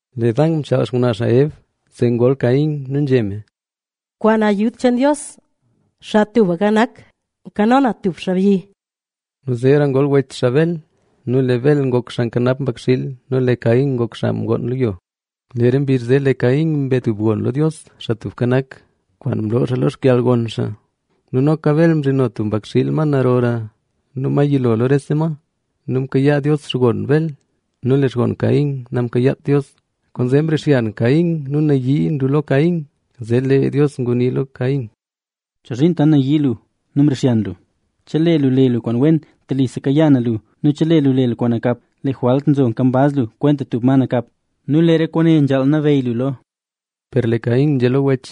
Lee Dan mchaal xngwnaa xaa Eb, zee ngol Caína nu nzhé me: “Kwaan yud cheen Dios, Xaa Tubka Nak, nkano na tub xaabyi”. Nu zeera ngol wech xaa Bel. Nu lee Bel ngok xaa nkanap mbakxiil. Nu lee Caín ngok xaa mgoon lo yo. Lee re mbizh zee lee Caín mbe tub gon lo Dios, Xaa Tubka Nak, kwaan mloo xaa lo xkalgon xaa. Nu noka Bel mzhino tub mbakxiil, ma narora nu ma yilo lo rese ma. Nu mkayaa Dios xkon Bel; nu lee xkon Caín namkayaat Dios. Kwaanzee mrixyan Caín nu nayii nlu lo Caín. Zee lee Dios ngunii lo Caín: —¿Chozhiin tant nayii lu nu mrixyan lu? Chelee lu le lu kwaan wen, telise kayaa na lu. Nu chelee lu le lu kwaan nakap, lee jwalt nzo nkambaz lu kwenta tub ma nakap. Nu lee re kwaane nzhaal nabeyy lu lo. Per lee Caín nzhé lo wech: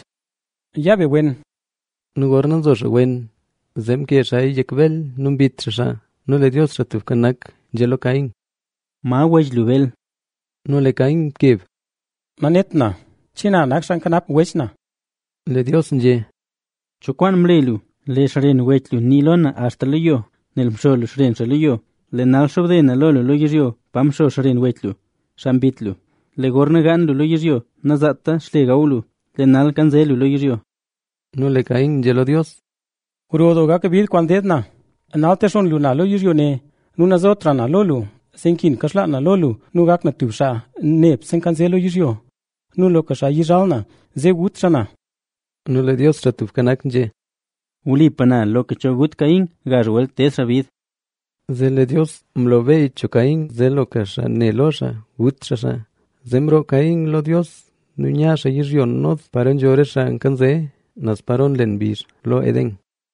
—Ya be wen. Nu gorna nzo xaa wen, zee mkee xaaya yek Bel nu mbit xaa xaa. Nu lee Dios, Xaa Tubka Nak, nzhé lo Caín: —¿Ma wech lu, Bel? Nu lee Caín mkeb: —Nanet na, ¿che na nak xaa nkanap wech na? Lee Dios nzhé: —¿Cho kwaan mle lu? Lee xren wech lu ngunii lo na axta lo yo, nel mxo lu xren xaa lo yo. Lee nal xobde na lo lu lo yizhyo pa mxo xren wech lu, xaa mbit lu. Lee gorna gaan lu yizhyo zee nazaata xle gaw lu; lee nal yanze lu lo yizhyo. Nu lee Caín nzhé lo Dios: —Gro doo gak bid kwaan deed na. Nal texonn lu na lo yizhyo ne nu nazotra na lo lu, zee nkin kaxlaan na lo lu nu gak na tub xaa nebse nkanze lo yizhyo. Nu loka xaa yizhal na, zee gut xaa na. Nu lee Dios, Xaa Tubka Nak, nzhé: —Wlipa na loka cho gut Caín, gazh welt ded xaa bid. Zee lee Dios mlo beey cho Caín, zee loka cho ne lo xaa naguta xaa xaa. Zee mroo Caín lo Dios nu nya xaa yizhyo Nod, paro nzho re xaa nkanze, naz paro nlen mbizh lo Edén.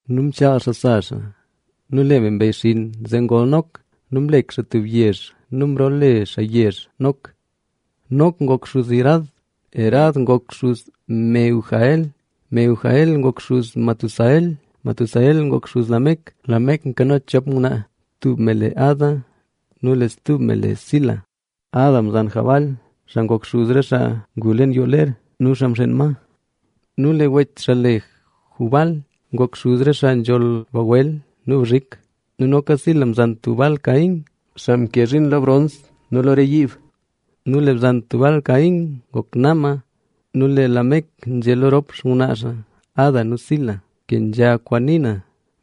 Nu mchaal xaa sa xaa, nu lee me mbeyxinn, zee ngol Nok. Nu mlek xaa tub yezh nu mloole xaa yezh zee Nok. Nok ngok xuz Irad, Irad ngok xuz Mehujael, Mehujael ngok xuz Metusael, Metusael nguk xuz Lamec. Lamec nkano chop ngwnaa, tub me le Ada nu stub me le Zila. Ada mzan Jabal, xaa ngok xuz re xaa ngu leen yoo ler nu xaa mxeen ma. Nu lee wech xaa, xaa le Jubal, ngok xuz re xaa nzholl bagwel nu bzhik. Nu noka Sila mzan Tubal-caín, xaa nke zhiin lo brons nu lo re yiib. Nu lee bzan Tubal-caín, ngok Naama. Nu zee Lamec nzhé lo rop xngwnaa xaa, Ada nu Zila: Kenzha kwaan nii na,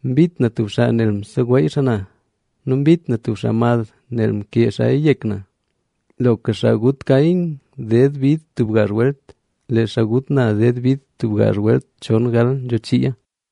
mbit na tub xaa nel mseweey xaa na nu mbit na tub xaa mad nel mkee xaaya yek na. Loka xaa gut Caín ded bid tub gazh welt, lee xaa gut na ded bid gazh welt chongal nzho chii.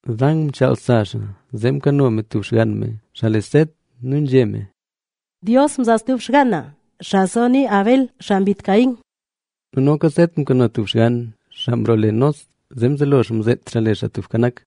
Dan mchaal sa xaa, zee mkano me stub xgann me, xaa le Set.b Nu nzhé me: “Dios mzaa stub xgaan na, xaa zonii Bel, xaa mbit Caín”. Nu noka Set mkano tub xgann, xaa mloole xaa Enós. Zee mzelo xaa mzeet xaa le Xaa Tubka Nak.